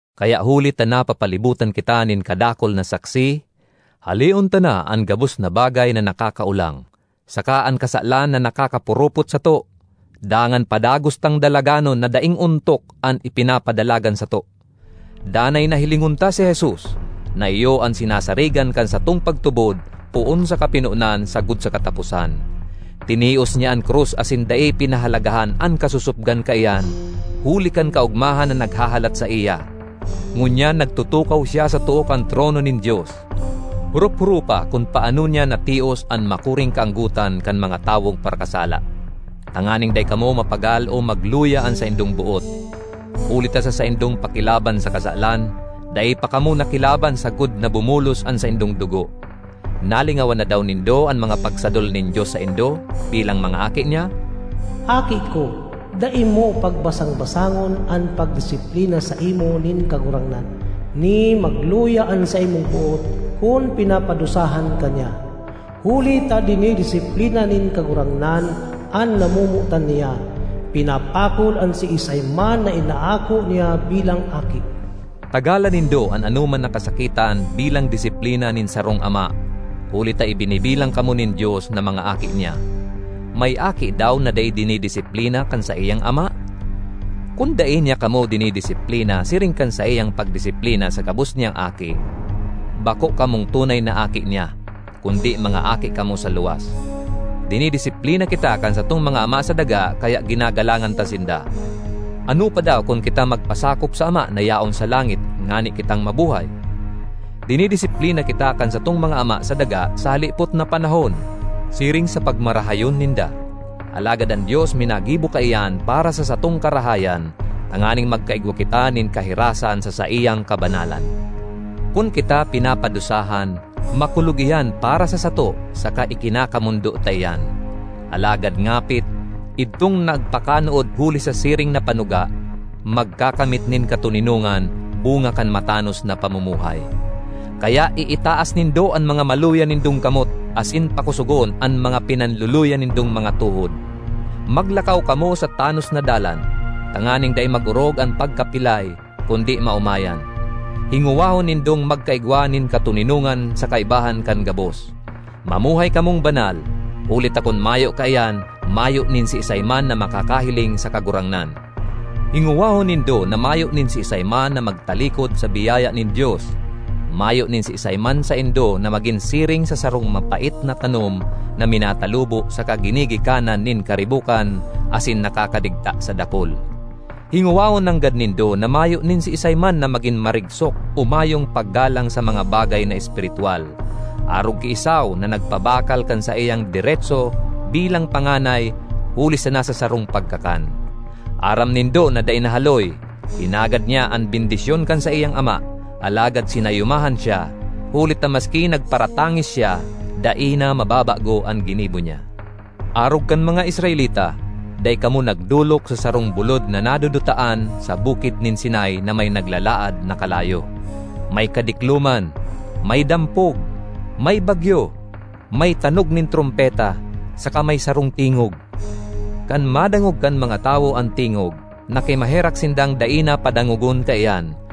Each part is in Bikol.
Kaya huli ta napapalibotan kita nin kadakul na saksi, haleon ta na an gabos na bagay na nakakaolang, saka an kasalan na nakakapurupot sato, dangan padagos tang dalaganon na daing ontok an ipinapadalagan sato. Danay na hilingon ta si Jesus, na iyo an sinasarigan kan satong pagtubod poon sa kapinonan sagkod sa kataposan. Tinios niya an krus asin dai pinahalagahan an kasosopgan kaiyan huli kan kaogmahan na naghahalat saiya; ngunyan nagtutukaw siya sa too kan trono nin Dios. Horop-horopa kun paano niya natios an makuring kaanggotan kan mga tawong parakasala, tanganing dai kamo mapagal o magluya an saindong boot. Huli ta sa saindong pakilaban sa kasalan, dai pa kamo nakilaban sagkod na bumulos an saindong dugo. Nalingawan na daw nindo an mga pagsadol nin Dios saindo bilang mga aki niya? “Aki ko, dai mo pagbasang-basangon an pagdisiplina saimo nin Kagurangnan, ni magluya an saimong boot kun pinapadusahan ka niya. Huli ta dinidisiplina nin Kagurangnan an namomotan niya, pinapakol an siisay man na inaako niya bilang aki.” Tagalan nindo an anoman na kasakitan bilang disiplina nin sarong ama, huli ta ibinibilang kamo nin Dios na mga aki niya. May aki daw na dai dinidisiplina kan saiyang ama? Kun dai niya kamo dinidisiplina siring kan saiyang pagdisiplina sa gabos niyang aki, bako kamong tunay na aki niya, kundi mga aki kamo sa luwas. Dinidisiplina kita kan satong mga ama sa daga kaya ginagalangan ta sinda. Ano pa daw kun kita magpasakop sa Ama na yaon sa langit ngani kitang mabuhay! Dinisiplina kita kan satong mga ama sa daga sa halipot na panahon, siring sa pagmarahayon ninda; alagad an Dios minagibo kaiyan para sa satong karahayan, tanganing magkaigwa kita nin kahirasan sa saiyang kabanalan. Kun kita pinapadusahan, makulog iyan para sa sato saka ikinakamondo ta iyan; alagad ngapit, idtong nagpakanood huli sa siring na panuga, magkakamit nin katoninongan, bunga kan matanos na pamumuhay. Kaya iitaas nindo an mga maluya nindong kamot asin pakosogon an mga pinanluluya nindong mga tuhod. Maglakaw kamo sa tanos na dalan, tanganing dai mag-orog an pagkapilay, kundi maomayan. Hingowahon nindong magka-igwa nin katoninongan sa kaibahan kan gabos; mamuhay kamong banal, huli ta kun mayo kaiyan, mayo nin siisay man na makakahiling sa Kagurangnan. Hingowahon nindo na mayo nin siisay man na magtalikod sa biyaya nin Dios; mayo nin siisay man saindo na magin siring sa sarong mapait na tanom na minatalubo saka ginigikanan nin karibokan asin nakakadigta sa dakul. Hingowahon nanggad nindo na mayo nin siisay man na magin marigsok o mayong paggalang sa mga bagay na espiritwal, arog ki Esau na nagpabakal kan saiyang deretso bilang panganay huli sana sa sarong pagkakan. Aram nindo na dai nahaloy, hinagad niya an bendisyon kan saiyang ama, alagad sinayumahan siya, huli ta maski nagparatangis siya, dai na mababago an ginibo niya. Arog kan mga Israelita, dai kamo nagdolok sa sarong bulod na nadudutaan—sa Bukid nin Sinai na may naglalaad na kalayo, may kadikloman, may dampog, may bagyo, may tanog nin trompeta, saka may sarong tingog. Kan madangog kan mga tawo an tingog, nakimaherak sindang dai na padangogon kaiyan,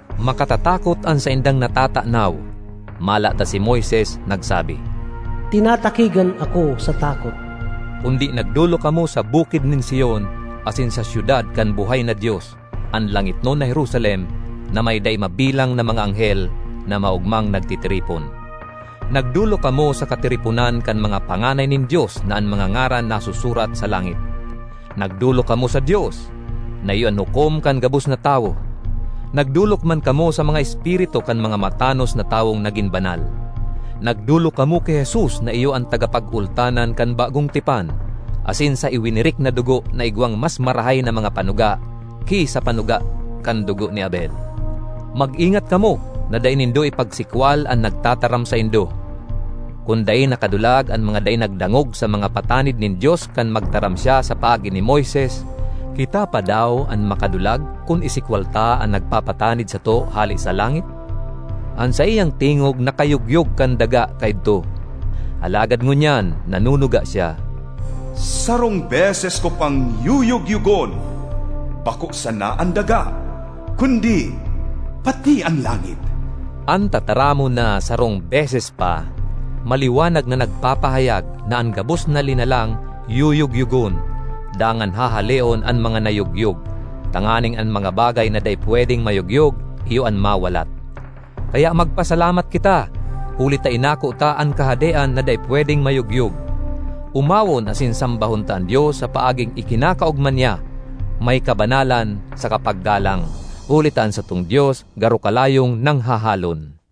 Makatatakot an saindang natatanaw, mala ta si Moises nagsabi, “Tinatakigan ako sa takot.” Kundi nagdolok kamo sa Bukid nin Sion asin sa syudad kan buhay na Dios, an langitnon na Jerusalem, na may dai mabilang na mga anghel na maogmang nagtitiripon. Nagdolok kamo sa katiriponan kan mga panganay nin Dios na an mga ngaran nasusurat sa langit. Nagdolok kamo sa Dios, na iyo an hukom kan gabos na tawo; nagdolok man kamo sa mga espiritu kan mga matanos na tawong nagin banal. Nagdolok kamo ki Jesus na iyo an tagapagultanan kan bagong tipan, asin sa iwinirik na dugo na igwang mas marahay na mga panuga ki sa panuga kan dugo ni Abel. Mag-ingat kamo na dai nindo ipagsikwal an nagtataram saindo. Kun dai nakadulag an mga dai nagdangog sa mga patanid nin Dios kan magtaram siya sa paagi ni Moises, kita pa daw an makadulag kun isikwal ta an nagpapatanid sato hale sa langit? An saiyang tingog nakayugyog kan daga kaidto, alagad ngunyan nanunuga siya, “Sarong beses ko pang yuyugyogon bako sana an daga kundi pati an langit.” An tataramon na “sarong beses pa” maliwanag na nagpapahayag na an gabos na linalang yuyugyogon, dangan hahaleon an mga nayogyog, tanganing an mga bagay na dai pwedeng mayugyog iyo an mawalat. Kaya magpasalamat kita, huli ta inako ta an kahadean na dai pwedeng mayugyog. Omawon asin sambahon ta an Dios sa paaging ikinakaogma niya, may kabanalan saka paggalang, huli ta an satong Dios garo kalayong nanghahalon.